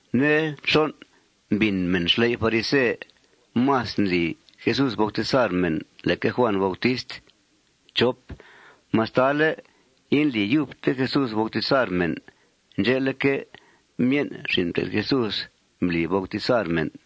Nde nxon', mbìn mèn xley' farise más ndli Jesús bautizar mèn leque Juàn Bautist, mastale indli yubte Jesús bautizar mèn. Ndxe'leque', myen' xin' mté'th Jesús mbli bautizar mèn.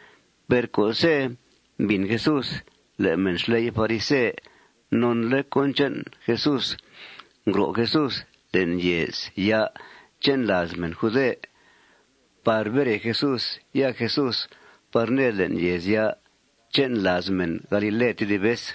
Per co'se' mbìn Jesús le' mèn xley' farise nonle' cón che'n Jesús, ngro' Jesús le'n yèezya' che'n làaz mèn jude par bere Jesús, ya Jesús par ned le'n yèezya' che'n làaz mèn galile tedib vez.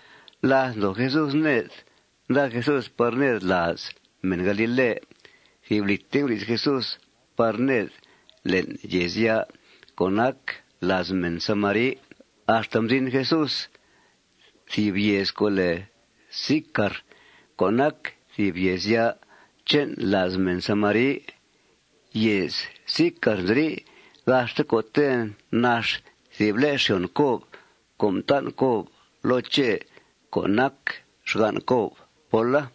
Láth ndoo Jesús ned, nda Jesús par ned làaz mèn galile, thìb lì nguri'th Jesús par ned le'n yèezya' co' nac làaz mèn samari, axta mzin Jesús thìb yèez co' lèe Sicar co' nac thìb yèezya' che'n làaz mèn samari. Yèez Sicar nziri' gaxte co'te' nax thìb le' xyòn Cob co' mtan' Cob loo Chè co' nac xgan' Cob póla.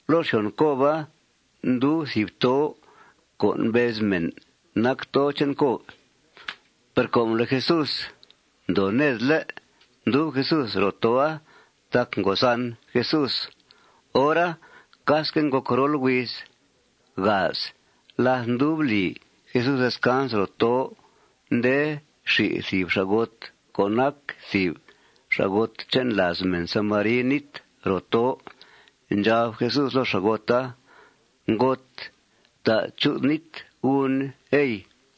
Loo xyòn Coba ndub thìb tó' co' mbez mèn nac tó' che'n Cob. Per com le' Jesús ndoo ned, ¿lé'?, mdub Jesús ro tó'a tac ngo zan Jesús. Hora casque' ngòc rol huiz. Láth ndub li Jesús descans ro tó', nde xi thìb xa'got co' nac thìb xa'got che'n làaz mèn samari nít ro tó'. Ndxab Jesús loo xa'gota: ―Ngot, fta' chu'th nít gun, ey.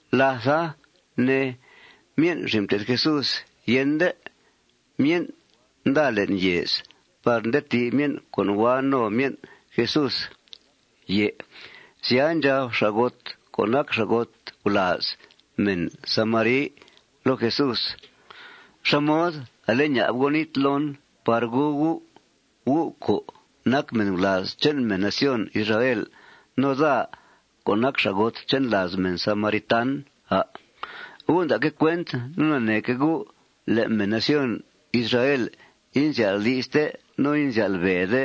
Látha ne, myen' xin' mté'th Jesús yende. Myen' nda le'n yèez par nda ti' myen' co' hua no myen' Jesús. Sya, ndxab xa'got co' nac xa'got gulàaz mèn samari loo Jesús: ―¿Xá mod ale ña'b U' nít loon par gu U', U' co' nac mèn gulàaz che'n mèn nación Israel, no daa co' nac xa'got che'n làaz mèn samaritan, à'? Gu' nda'que' cuent no naneeque' gu' le' mèn nación Israel inzyál' di'ste no inzyál' be'de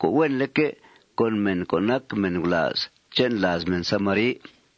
co' huenleque' con mèn co' nac mèn gulàaz che'n làaz mèn samari.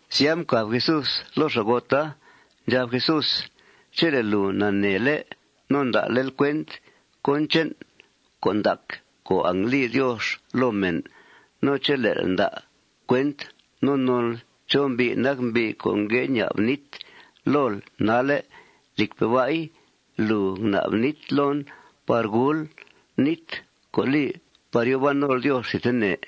Sya, mcàb Jesús loo xa'gota. Ndxab Jesús: ―Chele' lùu naneele' no nda'lel cuent cón che'n con' ndac co' angli Diox loo mèn, no chele'l nda' cuent no nonl chó mbi' nac mbi' co' ngue ña'b nít lool nalle', lìcpe' ba'i, lùu ngna'b nít loon par gul, nít co' li par yòo ban nol Diox thidtene.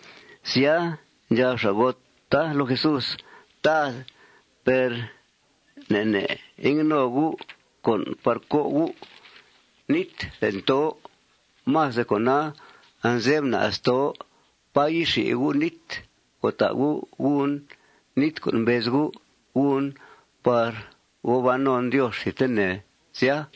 Sya, ndxab xa'gota loo Jesús: ―Tad, per ne' ne' ingue no U' con' par co' U' nít le'n tó'. Más de cona, anze'f na's tó'. ¿Pá yixi U' nít co' ta' U' gun, nít co' mbez U' gun par gòo ban non Diox thidtene, sya?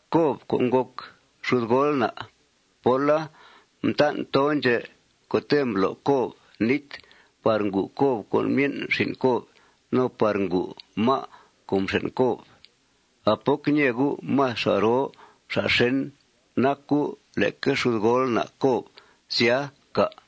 Cob co' ngòc xudgool na' póla mtan' tó' ndxè' co'te' mblo' Cob nít par ngu Cob con myen' xin' Cob no par ngu má' co' mxèn' Cob. ¿A poc ñee U' más xa' roo xa' xèn nac U' leque xudgool na' Cob sya, cà'?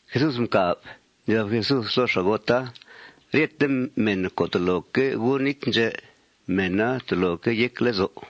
Jesús mcàb. Ndxab Jesús loo xa'gota: ―Ryete mèn co' toloque' gu nít ndxè', mèna toloque' yec lezo'.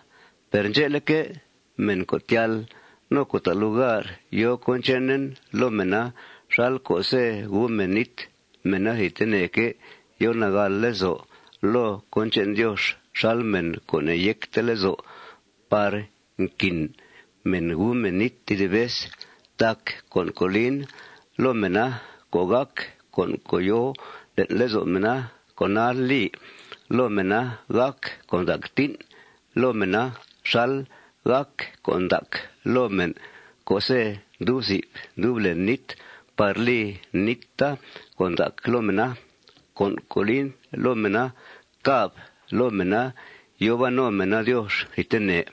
Per ndxe'leque', mèn co' tyal no co' ta' lugar yòo cón chenen loo mèna xal co'se' gu mèn nít, mèna thidteneque' yo nagàl lezo' loo cón che'n Diox xal mèn co' ne'yecte lezo' par nquin mèn gu mèn nít tedib vez. Tac con' co' lin loo mèna co' gàc con' co' yòo le'n lezo' mèna, con'a li loo mèna gàc con' ndac tín' loo mèna xal gàc con' ndac loo mèn co'se' ndub zib ndub len nít par li níta con' ndac loo mèna. Con' co' lin loo mèna càb loo mèna yòo ban no mèna Diox thidtene.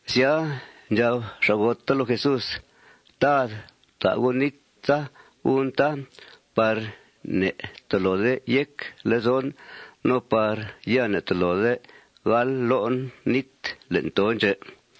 Sya, ndxab xa'gota loo Jesús: ―Tad, fta' U' níta gun, tá, par ya ne'tolode yec lezon no par ya ne'tolode gal lo'en nít le'n tó' ndxè'.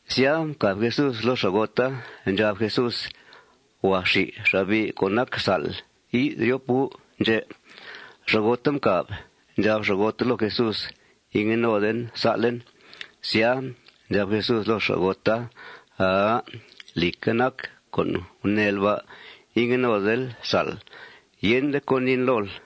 Sya, mcàb Jesús loo xa'gota. Ndxab Jesús: ―Huàa xi xa'bi' co' nac sa'll. Yi'th ryop gu' ndxè'. Xa'gota mcàb. Ndxab xa'gota loo Jesús: ―Ingue noden sa'len. Sya, ndxab Jesús loo xa'gota: ―Aa. Lìcque' nac co' guneel ba': Ingue nodel sa'l. Yende con' niin lool.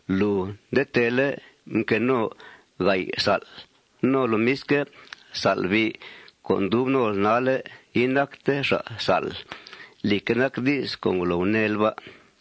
Lùu nde teele' mque no ga'y sa'l. No lomisque', xa'bi' co' ndub nol nalle' inacte xa' sa'll. Lìcque' nac di's co' ngolo guneel ba'.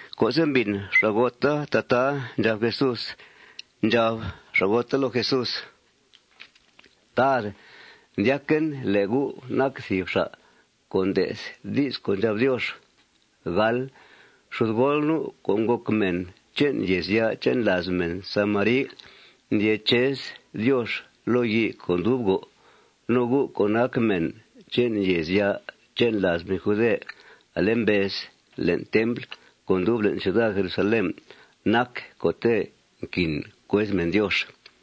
Co'se' mbìn xa'gota tataa ndxab Jesús, ndxab xa'gota loo Jesús: ―Tad, ndyaquen le' U' nac thìb xa' co' nde'th di's co' ndxab Diox. Xudgool nu', co' ngòc mèn che'n yèezya' che'n làaz mèn samari, ndyee chez Diox loo yii co' ndub go'. No gu', co' nac mèn che'n yèezya' che'n làaz mèn jude, ale mbez le'n templ co' ndub le'n ciuda Jerusalén nac co'te' nquin cuez mèn Diox.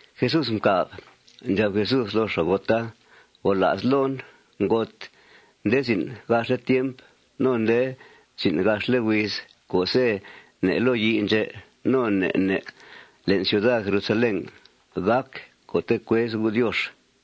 Jesús mcàb. Ndxab Jesús loo xa'gota: ―Gola's loon, ngot, nde zin' gaxle' tiemp no nde zin' gaxle' huiz co'se' ne' loo yii ndxè' no ne' ne' le'n ciuda Jerusalén gàc co'te' cuez gu' Diox.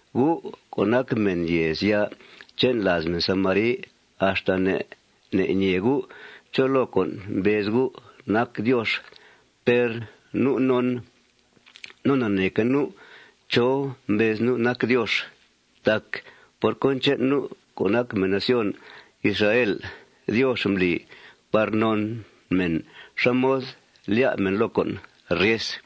Gu' co' nac mèn yèezya' che'n làaz mèn samari, axta ne' ne' ñee gu' chó loo con' mbez gu' nac Diox. Per nu' non no naneeque' nu' chó mbez nu' nac Diox. Tac por cón che'n nu' co' nac mèn nación Israel Diox mbli par non mèn xá mod lyá' mèn loo con' ryes.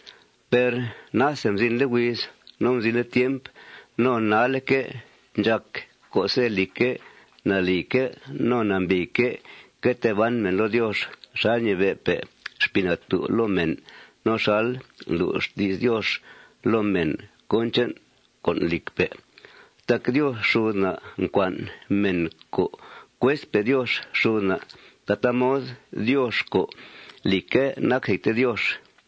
Per nase mzinle' huiz no mzinle' tiemp no nalle'que' ndxàc co'se', lìcque', nalìque' no nambìique' que tee ban mèn loo Diox xal ñibe'pe' Xpii Natú' loo mèn no xal ndlu' xti's Diox loo mèn cón che'n con' lìcpe'. Tac Diox xud na' ncua'n mèn co' cuezpe' Diox xud na' tataa mod, Diox co', lìcque', nac thidte Diox.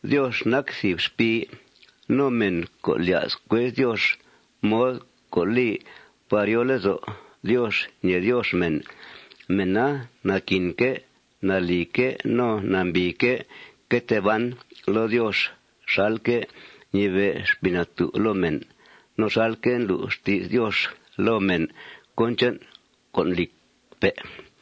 Diox nac thìb xpii. No mèn co' lya's cuez Diox mod co' li par yòo lezo' Diox ñèe Diox mèn, mèna naquinque' nalìque' no nambìique' que tee ban loo Diox xalque' ñibe'pe' Xpii Natú' loo mèn, no xalque' ndlu' xti's Diox loo mèn cón che'n con' lìcpe'.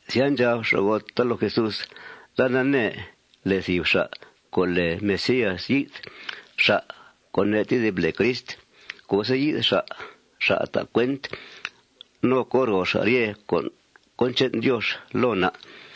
Sya, ndxab xa'gota loo Jesús: ―Daa nanee le' thìb xa' co' lèe Mesías yi'th, xa' co' ne' tedib lèe Crist. Co'se' yi'th xa', xa' ta' cuent no co ro xa' ryete con' cón che'n Diox loo na'.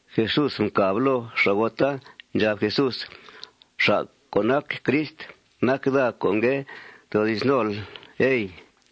Jesús mcàb loo xa'gota. Ndxab Jesús: ―Xa' co' nac Crist nac daa co' ngue toodi's nol, ey.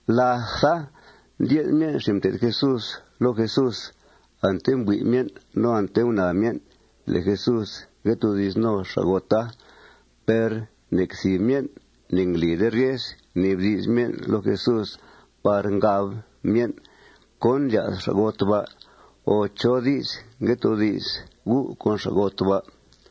Látha, ndye'th myen' xin' mté'th Jesús loo Jesús. Ante mbui' myen' no ante gunaa myen' le' Jesús ngue toodi's no xa'gota. Per nec thìb myen' ne'nglide ryes ngnibdi's myen' loo Jesús par ngab myen': ―¿Cón ndlya's xa'got ba' o chó di's ngue toodi's U' con xa'got ba'?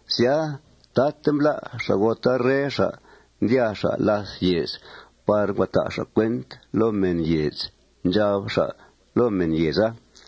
Sya, taate mblá' xa'gota rre xa'. Ndyàa xa' làth yèez par ngua ta' xa' cuenta loo mèn yèez. Ndxab xa' loo mèn yèeza: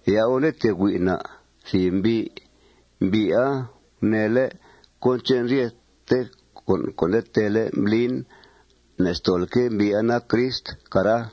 ―Ya' gu' nda tee hui' na' thìb mbi'. Mbi'a guneele' cón che'n ryethe con' nde teele' mblin. Ne'stolque' mbi'a nac Crist, cara.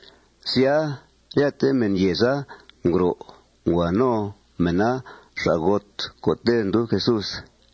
Sya, ryete mèn yèeza ngro'. Ngua no mèna xa'got co'te' ndub Jesús.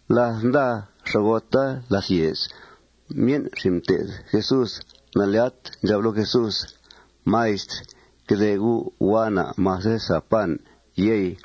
Láth nda xa'gota làth yèez, myen' xin' mté'th Jesús nalyat ndxab loo Jesús: ―Maistr, que de U'. Hua na' mase sa pan, yey.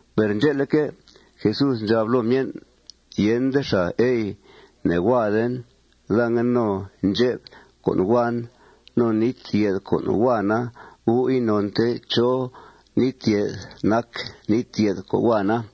Per ndxe'leque', Jesús ndxab loo myen': ―Yende xàa, ey. Ne'huaden. Daa ngue no ndxep con' huan. No nít yèth co' huana, gu' inonte chó nít yèth nac nít yèth co' huana.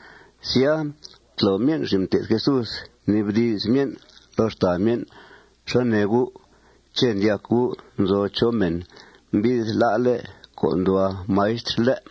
Sya, mtlo myen' xin' mté'th Jesús, mnibdi's myen' loo xtàa myen': ―¿Xá nee gu'? ¿Ché' ndyac gu' nzo chó mèn mbi'th lá'le' con' nduhua maistr, lé'?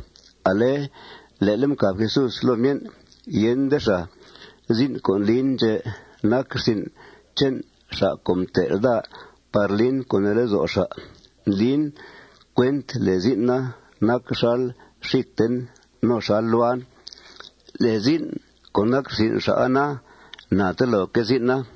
Ale le'le' mcàb Jesús loo myen': ―Yende xàa. Zin' co' ndlin ndxè' nac rsin' che'n xa' co' mtel' daa par lin co' nee lezo' xa'. Ndlin cuent le' zin'a nac xal xíten no xal luan. Le' zin' co' nac rsin' xa'a na, na teloque' zin'a.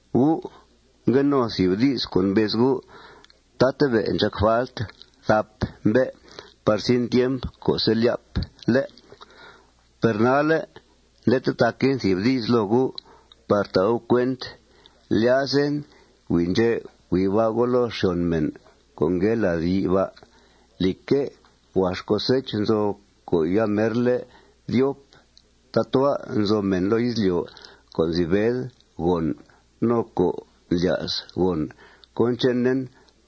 Gu' ngue no thìb di's co' mbez gu': Tatabe' ndxàc falt thap mbe' par zin tiemp co'se' lyáp, ¿lé'? Per nalle' nde tetaquen thìb di's loo gu' par ta' gu' cuent: Lyazen hui' ndxè' hui' ba' gu' loo xyòn mèn co' ngue lad yii ba'. Lìcque', huax cosech nzo co' yamerle' dyop. Tatua' nzo mèn loo izlyo' co' nzi bed gòn no co' ndlya's gòn cón chenen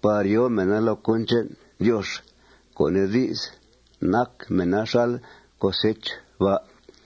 par yòo mèna loo cón che'n Diox, co' nee di's, nac mèna xal cosech ba'.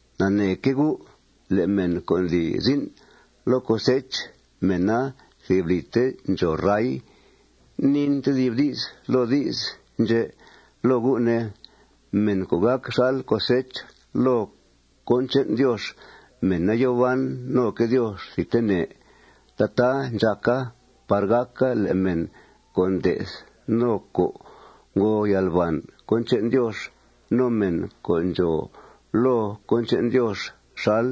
Naneeque' gu' le' mèn co' ndli zin' loo cosech, mèna thìb lìte ndxòo ray. Niin tedib di's loo di's ndxè' loo gu', ne: Mèn co' gàc xal cosech loo cón che'n Diox, mèna yòo ban noque' Diox thidtene. Tataa ndxàca par gàca le' mèn co' nde'th no co' ngo yalbàn cón che'n Diox, no mèn co' ndxòo loo cón che'n Diox xal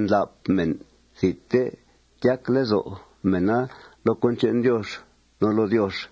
ndláp mèn, thidte tyac lezo' mèna loo cón che'n Diox no loo Diox.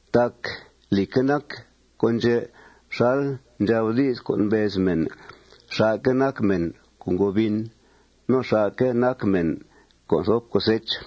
Tac lìcque' nac con' ndxè' xal ndxab di's co' mbez mèn: Xà'que' nac mèn co' ngo bin. No xà'que' nac mèn co' nthop cosech.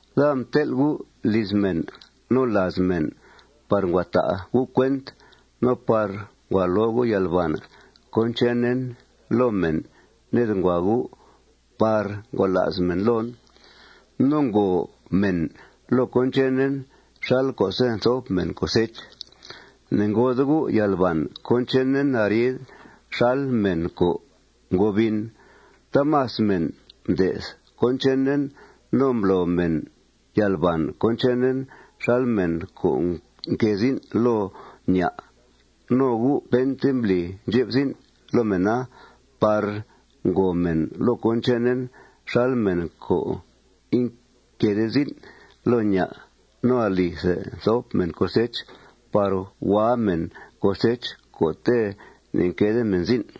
Daa mtel' gu' liz mèn no làaz mèn par ngua ta' gu' cuent no par ngua lo gu' yalbàn cón chenen loo mèn ned ngua gu' par ngola's mèn loon no ngòo mèn loo cón chenen xal co'se' nthop mèn cosech. Ne'ngode gu' yalbàn cón chenen arid xal mèn co' ngo bin. Taamas mèn mde'th cón chenen no mblo mèn yalbàn cón chenen xal mèn co' mque' zin' loo ña'. No gu' pente mbli ndxep zin' loo mèna par ngòo mèn loo cón chenen xal mèn co' inque'de zin' loo ña' no alithe mthop mèn cosecha par hua mèn cosech co'te' ne'nque'de mèn zin'.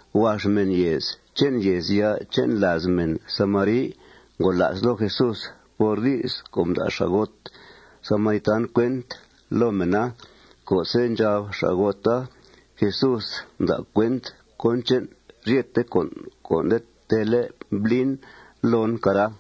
Huax mèn yèez che'n yèezya' che'n làaz mèn samari ngola's loo Jesús por di's co' mda' xa'got samaritan cuent loo mèna co'se' ndxab xa'gota: Jesús mda' cuent cón che'n ryete con' co' nde teele' ndlin loon, cara.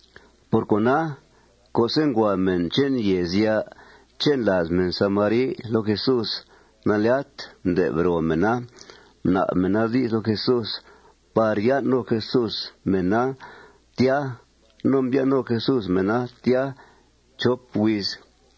Por cona, co'se' ngua mèn che'n yèezya' che'n làaz mèn samari loo Jesús, nalyat mde'b ro mèna. Mna'b mèna di's loo Jesús par yan' no Jesús mèna tya. No mbyan' no Jesús mèna tya chop huiz.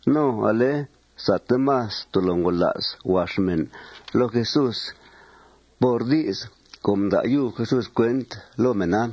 No ale sate más tolo ngola's huax mèna loo Jesús por di's co' mda' yub Jesús cuent loo mèna.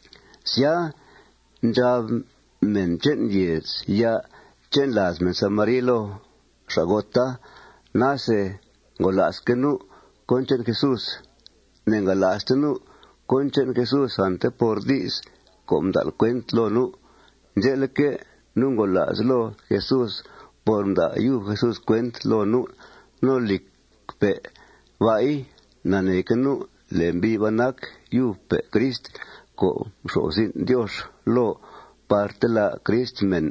Sya, ndxab mèn che'n yèezya' che'n làaz mèn samari loo xa'gota: ―Nase ngola'sque' nu' cón che'n Jesús. Ne'ngala'ste nu' cón che'n Jesús ante por di's co' mda'l cuent loo nu'. Ndxe'leque', nu' ngola's loo Jesús por mda' yub Jesús cuenta loo nu'. No, lìcpe' ba'i, naneeque' nu' le' mbi' ba' nac yubpe' Crist co' mxo'f zin' Diox loo par ntelá' Crist mèn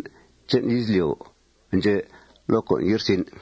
che'n izlyo' ndxè' loo con' ye'rsin'.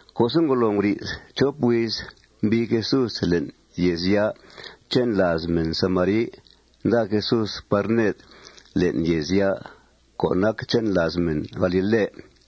Co'se' ngolo nguri'th chop huiz, mbii Jesús le'n yèezya' che'n làaz mèn samari. Nda Jesús par ned le'n yèezya' co' nac che'n làaz mèn galile.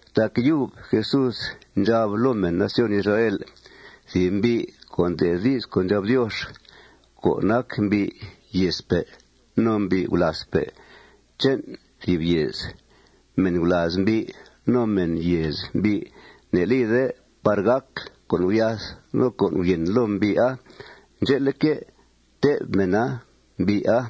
Tac yub Jesús ndxab loo mèn nación Israel: ―Thìb mbi' co' nde'th di's co' ndxab Diox, co' nac mbi' yèezpe' no mbi' gulàazpe' che'n thìb yèez, mèn gulàaz mbi' no mèn yèez mbi' ne'lide par gàc con' guryath no con' guryèn loo mbi'a. Ndxe'leque', tè'b mèna mbi'a.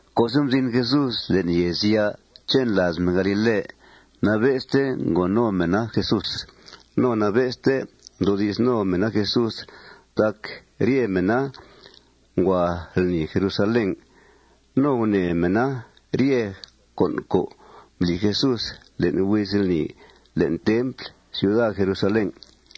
Co'se' mzin Jesús le'n yèezya' che'n làaz mèn galile, nabe'ste ngo no mèna Jesús. No nabe'ste mdoodi's no mèna Jesús tac rye mèna ngua lni Jerusalén. No gunèe mèna rye con' co' mbli Jesús le'n huiz lni le'n templ ciuda Jerusalén.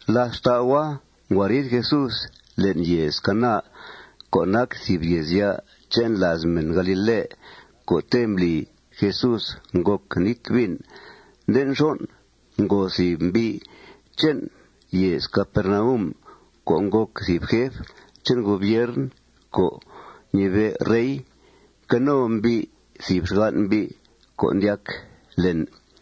Làth xtau'a, ngua riid Jesús le'n yèez Caná, co' nac thìb yèezya' che'n làaz mèn galile, co'te' mbli Jesús ngòc nít vin. Nde nxon', ngo thìb mbi' che'n yèez Capernaum co' ngòc thìb jef che'n gobiern co' ñibe' rey. Mque no mbi' thìb xgan' mbi' co' ndyac len.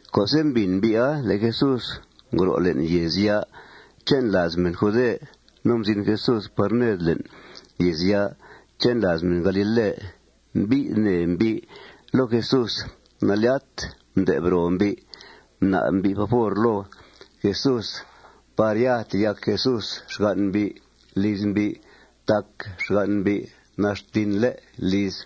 Co'se' mbìn mbi'a le' Jesús ngro' le'n yèezya' che'n làaz mèn jude no mzin Jesús par ned le'n yèezya' che'n làaz mèn galile, mbi'th nee mbi' loo Jesús. Nalyat mde'b ro mbi'. Mna'b mbi' favor loo Jesús par ya teyac Jesús xgan' mbi' liz mbi' tac xgan' mbi' nax tinle' liz.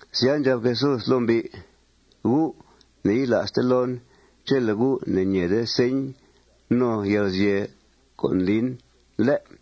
Sya, ndxab Jesús loo mbi': ―Gu' ne'yila'ste loon chele' gu' ne'ñèede señ no yalguzye' co' ndlin, ¿lé'?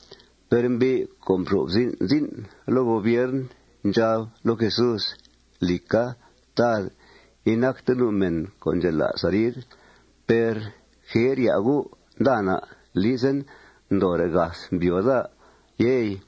Per mbi' co' mxo'f zin' zin' loo gobiern ndxab loo Jesús: ―Lìca, Tad, inacte nu' mèn co' ndxela's arid. Per jer ya' U', nda na' lizen ndoore' gath mbyòo daa, yey.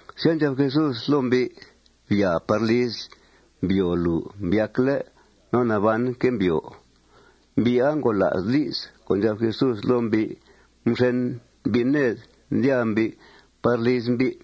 Sya, ndxab Jesús loo mbi': ―Byàa par lizl. Mbyòo lùu mbyacle'. No nabanque' mbyòo. Mbi'a ngola's di's co' ndxab Jesús loo mbi'. Mxen mbi' ned, ndyàa mbi' par liz mbi'.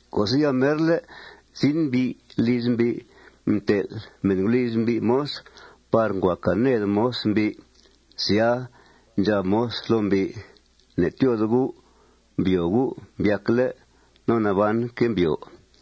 Co'se' yamerle' zin mbi' liz mbi', mtel' mèn guliz mbi' moz par ngua càa ned moz mbi'. Sya, ndxab moz loo mbi': ―Ne'tyóode U'. Mbyòo U' mbyacle'. No nabanque' mbyòo.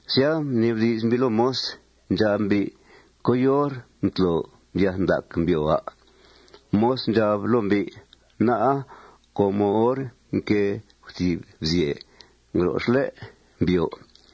Sya, mnibdi's mbi' loo moz. Ndxab mbi': ―¿Coyor mtlo mbyath ndac mbyòo, à'? Moz ndxab loo mbi': ―Ná'a com hor mquée guthìb bzyè ngro xlé' mbyòo.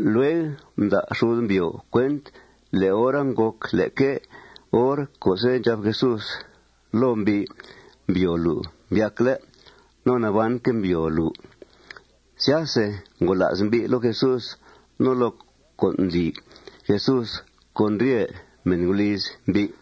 Lueg mda' xud mbyòo cuent le' hora ngòc leque hor co'se' ndxab Jesús loo mbi': ―Mbyòo lùu mbyacle'. No nabanque' mbyòo lùu. Syase ngola's mbi' loo Jesús no loo con' ndli Jesús con rye mèn guliz mbi'.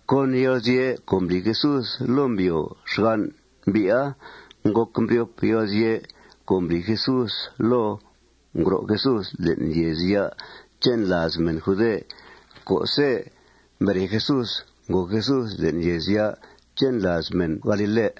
Con yalguzye' co' mbli Jesús loo mbyòo xgan' mbi'a, ngòc mbryop yalguzye' co' mbli Jesús loo ngro' Jesús le'n yèezya' che'n làaz mèn jude co'se' mbere Jesús, ngòo Jesús le'n yèezya' che'n làaz mèn galile.